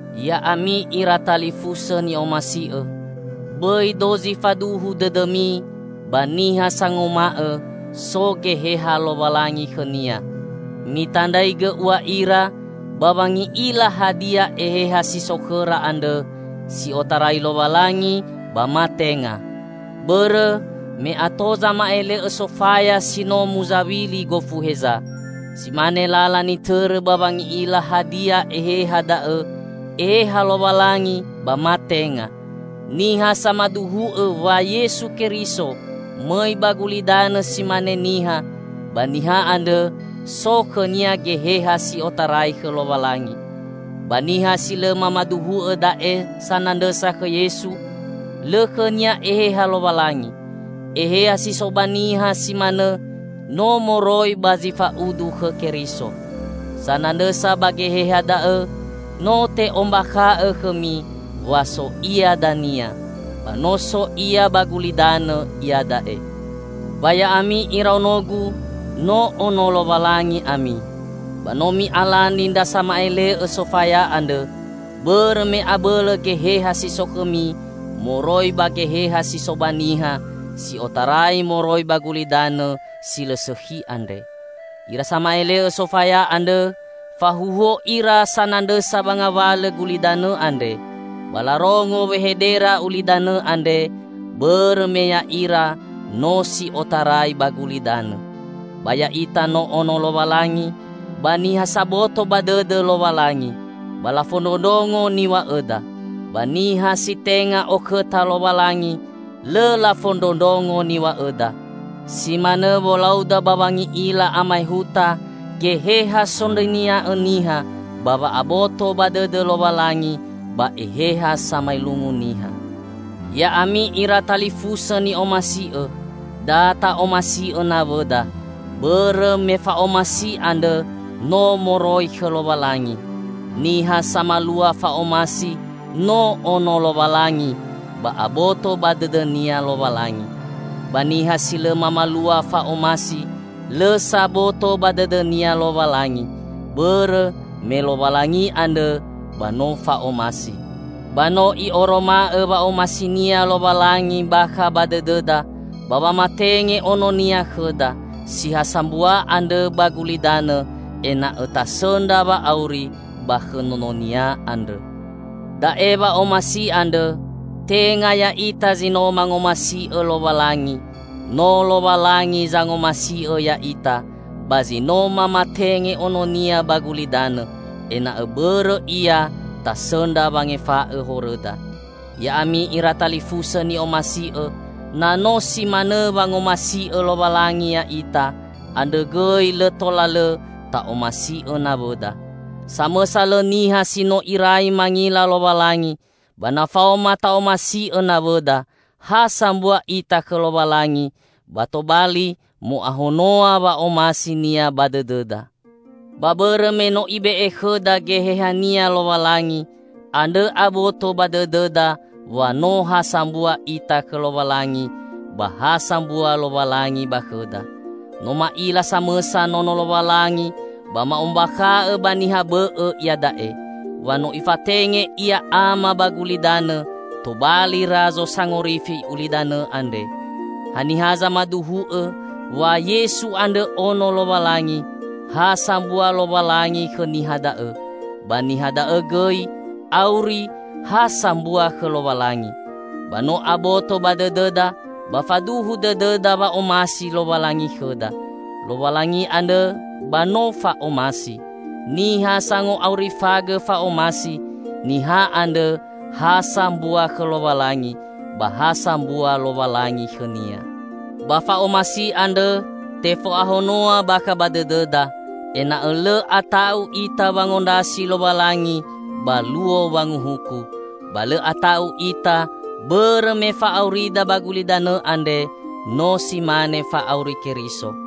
Ya'ami ira talifusõ ni'omasi'õ! Bõi dozi faduhu dõdõmi ba niha sanguma'õ so Geheha Lowalangi khõnia, mitandraigõ ua ira ba wangi'ila hadia eheha si so khõra andrõ si otarai Lowalangi ba ma tenga. Bõrõ me ato zama'ele'õ sofaya si no muzawili gofu heza. Si mane lala nitõrõ ba wangi'ila hadia eheha da'õ Eheha Lowalangi ba ma tenga: Niha samaduhu'õ wa Yesu Keriso mõi ba gulidanõ si mane niha, ba niha andrõ so khõnia Geheha si otarai khõ Lowalangi. Ba niha si lõ mamaduhu'õ da'e sanandrõsa khõ Yesu, lõ khõnia Eheha Lowalangi. Eheha si so ba niha si manõ no moroi ba zi fa'udu khõ Keriso. Sanandrõsa ba geheha da'õ no te'ombakha'õ khõmi wa so ia dania. Ba no so ia ba gulidanõ iada'e. Ba ya'ami iraonogu, no Ono Lowalangi ami. Ba no mi'alani ndra sama'ele'õ sofaya andrõ, bõrõ me abõlõ Geheha si so khõmi moroi ba geheha si so ba niha si otarai moroi ba gulidanõ si lõ sõkhi andre. Ira sama'ele'õ sofaya andrõ fahuhuo ira sanandrõsa ba ngawalõ gulidanõ andre, ba larongo wehedera ulidanõ andre, bõrõ me ya'ira no si otarai ba gulidanõ. Ba ya'ita no ono Lowalangi; ba niha saboto ba dõdõ Lowalangi, ba lafondrondrongo niw̃a'õda. Ba niha si tenga okhõta Lowalangi, lõ lafondrondrongo niw̃a'õda. Si manõ wolauda ba wangi'ila amaehuta Geheha sondrõnia'õ niha ba wa'aboto ba dõdõ Lowalangi ba eheha samaelungu niha. Ya'ami ira talifusõ ni'omasi'õ! Da ta'omasi'õ nawõda, bõrõ me fa'omasi andrõ no moroi khõ Lowalangi. Niha samalua fa'omasi, no ono Lowalangi ba aboto ba dõdõnia Lowalangi. Ba niha si lõ mamalua fa'omasi, lõ saboto ba dõdõnia Lowalangi; bõrõ me Lowalangi andrõ ba no fa'omasi. Ba no i'oroma'õ wa'omasi-Nia Lowalangi bakha ba dõdõda, ba wamatenge Ono-Nia khõda, si ha sambua andrõ ba gulidanõ ena'õ tasõndra wa'auri ba khõ Nono-Nia andrõ. Da'e wa'omasi andrõ: Tenga ya'ita zi no mangomasi'õ Lowalangi, no Lowalangi zangomasi'õ ya'ita ba si no mamatenge Ono-Nia ba gulidanõ, ena'õ bõrõ Ia tasõndra wangefa'õ horõda. Ya'ami ira talifusõ ni'omasi'õ, na no si manõ wangomasi'õ Lowalangi ya'ita, andrõ gõi lõ tola lõ ta'omasi'õ nawõda. Samõsa lõ niha si no irai mangila Lowalangi, ba na faoma ta'omasi'õ nawõda, ha sambua ita khõ Lowalangi ba tobali mo'ahonoa wa'omasi-Nia ba dõdõda. Ba bõrõ me no Ibe'e khõda Geheha-Nia Lowalangi, andrõ aboto ba dõdõda wa no ha sambua ita khõ Lowalangi, ba ha sambua Lowalangi ba khõda. No ma'ila samõsa Nono Lowalangi ba ma'ombakha'õ ba niha bõ'õ iada'e, wa no Ifatenge Ia Ama ba gulidanõ tobali Razo Sangorifi ulidanõ andre. Haniha zamaduhu'õ wa Yesu andrõ Ono Lowalangi, ha sambua Lowalangi khõ niha da'õ, ba niha da'õ gõi auri ha sambua khõ Lowalangi. Ba no aboto ba dõdõda ba faduhu dõdõda wa'omasi Lowalangi khõda. Lowalangi andrõ ba no fa'omasi. Niha sango'aurifagõ fa'omasi, niha andrõ ha sambua khõ Lowalangi, ba ha sambua Lowalangi khõnia. Ba fa'omasi andrõ tefo'ahonoa bakha ba dõdõda, ena'õ lõ ata'u ita wangondrasi Lowalangi ba Luo Wanguhuku. Ba lõ ata'u ita, bõrõ me fa'aurida ba gulidanõ andre, no si mane fa'auri Keriso.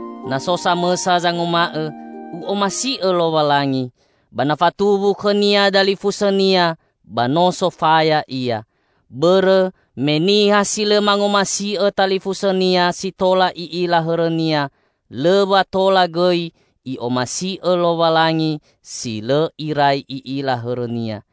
Na so samõsa zanguma'õ, "U'omasi'õ Lowalangi," ba na fatuwu khõnia dalifusõnia, ba no sofaya ia. Bõrõ me niha si lõ mangomasi'õ talifusõnia si tola i'ila hõrõnia, lõ wa tola gõi i'omasi'õ Lowalangi zi lõ irai i'ila hõrõnia.